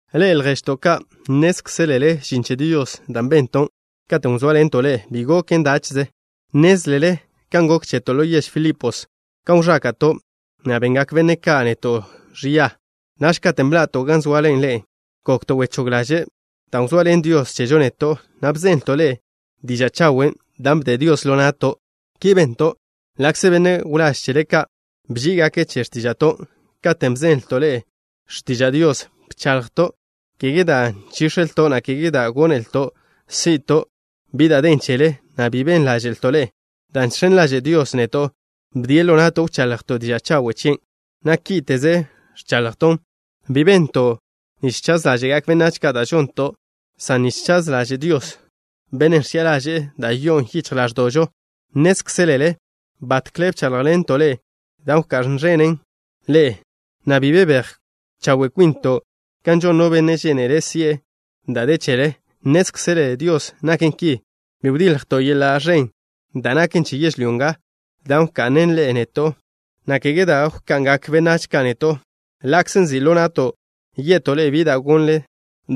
Ḻe'e, lježto' ka', nnézkzelele žin che Dios da' benton' katen' wzóaḻento' ḻe'e bi goken dáche'ze. Nnézlele kan gok cheto' ḻo yež Filipos, kan wẕáka'to', na' bengak benne' ka' neto' ẕia. Naž katen' bḻa'to' gan zoale ḻe'e gokto' wechóg ḻaže' dan' wzoaḻen Dios chežo neto', na' bzenlto' ḻe'e diža' chawen' da' bde Dios ḻo na'to'. Ki bento' ḻa'kze benne' wláž chele ka' bží'igake' che x̱tíža'to'. Katen' bzenlto' ḻe'e x̱tiža' Dios, bchaḻjto', kege dan' nchíx̱elto', na' kege dan' gónelto' si'to' bi da' den chele, na' bi ben ḻáže'lto' ḻe'e. Dan' žx̱en ḻaže' Dios neto', bdie' ḻo na'to' wchaḻjto' diža' chawe' chien', na' kíte'ze ẕchaḻjton'. Bi benton' nich chaz ḻáže'gak benách ka' da' žonto' san nich chaz ḻažen' Dios, Bennen' ẕchi'a ḻaže'e da' yo'on yichj ḻáẕdo'žo. Nnézkzelele batkle bcháḻjḻento' ḻe'e da' wká'n ẕenen ḻe'e, na' bi bebéj chawe' kwinto' kan žon no benne' žénele' si'e da' de chele. Nnézkzele Dios naken ki. Bi wdiljto' yeḻa' ẕen da' naken che yežlyó nga, dan' wka'nle ḻe'e neto', na' kege da' wka'ngak benách ka' neto'. Ḻa'kze nzi' ḻo na'to' ye'to' ḻe'e bi da' gonle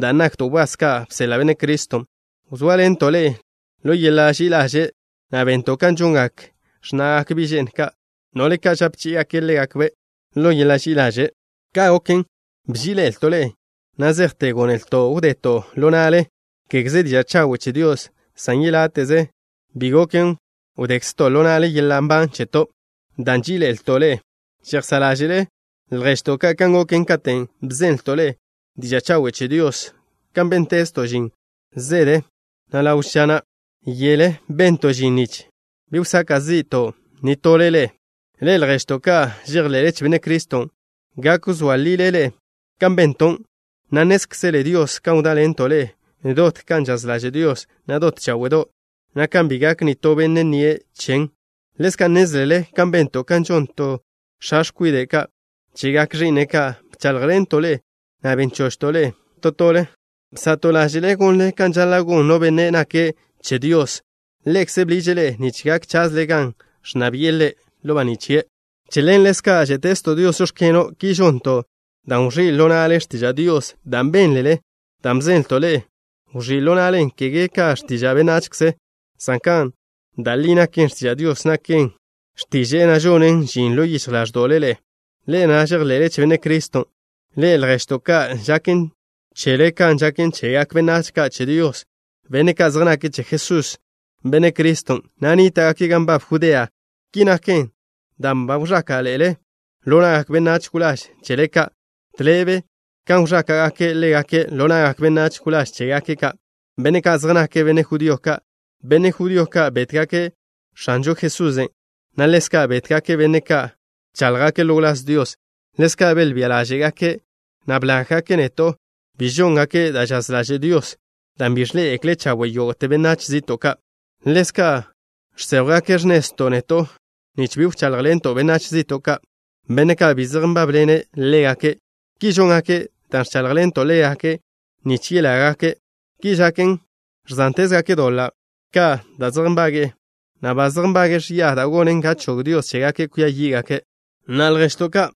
dan' nakto' wbás ka' bseḻa' Benne' Criston', wzóaḻento' ḻe'e ḻo yeḻa' ži'i ḻaže', na' bento' kan žongak x̱na'gak bi' že'ndo' ka', no'le ka' žape chí'igake' ḻégakbe' ḻo yeḻa' ži'i ḻaže'. Ka' goken, bží'iḻe'elto' ḻe'e, na' zejte gónelto' wdeto' ḻo na'le, kégeze diža' chawen' che Dios, san yeláte'ze bi goken wdekzto' ḻo na'le yeḻa' nban cheto', dan' nží'iḻe'elto' ḻe'e. Žejsá' ḻáže'le, lježto' ka', kan goken katen' bzenlto' ḻe'e diža' chawen' che Dios, kan béntezto' žin zede, na' ḻawe' ža, na' yele bento' žin nich bi wsaka' zi'to' nitole ḻe'e. Ḻe'e, lježto' ka' žejḻe'le che Benne' Criston', gak wzóa lile ḻe'e kan bento', na' nnézkzele Dios kan wdáḻento' ḻe'e dot kan žaz ḻaže' Dios, na' dot cháwe'do', na' kan bi gak nitó benne' nnie' chen. Ḻezka' nnézlele kan bento' kan žon to x̱a x̱kwide' ka' chegak ẕi'ne' ka', bcháḻjḻento' ḻe'e, na' ben chochto' ḻe'e to tole. Bsa'to' ḻáže'le gonle kan žaḻa' gon no benne' nake' che Dios. Ḻekze' bḻiže' ḻe'e nich gak chazle gan ẕnna bi'e Ḻe' ḻo baní' chie'. Che ḻen ḻezka' žé'tezto' Dios: “Žóx̱keno'.” Ki žonto' dan' wẕí' ḻo na'le x̱tiža' Dios da' bénlele, dan' bzenlto' ḻe'e. Wẕí' ḻo na'len, kege ka x̱tiža' benachze, san kan da' li naken, x̱tiža' Dios naken. X̱tiže'e na' žonen žin ḻo yichj ḻáẕdo'le ḻe'e, ḻe'e na' žejḻe'le che Benne' Criston'. Ḻe'e, lježto' ka', žaken chele kan žaken chegak benách ka' che Dios, benne' ka' zej nake' che Jesús, Benne' Criston', na' nníta'gake' gan nbab Judea. Ki naken dan' ba wẕáka'ḻe'ele ḻo na'gak benách wláž chele ka', tḻebe kan wẕáka'gake' ḻégake' ḻo na'gak benách wláž chégake' ka', benne' ka' zej nake' benne' judío ka'. Benne' judío ka' bétgake' X̱anžo Jesusen', na' ḻezka' bétgake' benne' ka' bcháḻjgake' ḻo wláz Dios. Ḻezka' belbía ḻáže'gake', na' blággake' neto'. Bi žóngake' da' žaz ḻaže' Dios, dan' bi ẕḻé'egekle' chawe' yógo'te benách zi'to' ka'. Ḻezka' žséjwgake' x̱nezto' neto', nich bi wcháḻjḻento' benách zi'to' ka', benne' ka' bi zej nbábḻene' ḻégake'. Ki žóngake' dan' ẕcháḻjḻento' ḻégake' nich yelágake'. Ki žaken, ẕzántezgake' doḻa' ka' da' zej nbage'e, na' ba zej nbage'e ẕia da' gonen ga chog Dios chégake' kwia yí'gake'. Na'a, lježto' ka',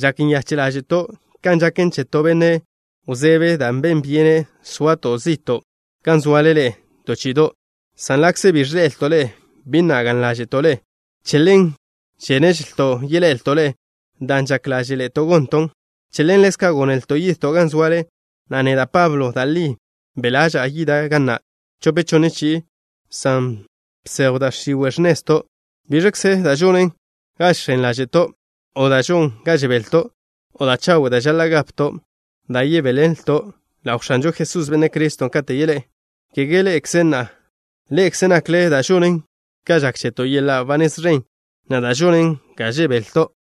žak nyache' ḻáže'to' kan žaken che to benne' wzebe dan' ben byene soato' zi'to' gan zoale ḻe'e to chi'ido', san ḻa'kze bi ẕḻe'elto' ḻe'e, bi na' gaḻ ḻáže'to' ḻe'e. Che ḻen, žéneželto' yeḻe'elto' ḻe'e, dan' žak ḻáže'ḻe'eto' gonton'. Che ḻen ḻezka' gónelto' yidto' gan zoale, na' neda', Pablo, da' li be' ḻaža'a yida' ga na' chope chonne chi'i, san bsejw da' x̱iwe' x̱nezto'. ¿Biẕkze da' žonen ga žx̱en ḻáže'to', o da' žon ga žebelto', o da' chawe' da' žaḻa' gapto', da' yebéḻenlto' ḻaw X̱anžo Jesús, Benne' Criston', katen' yeḻé'e? ¿Kege ḻe'ekze na'? Ḻe'ekze nakle da' žonen ga žak cheto' yeḻa' ba nez ẕen, na' da' žonen ga žebelto'.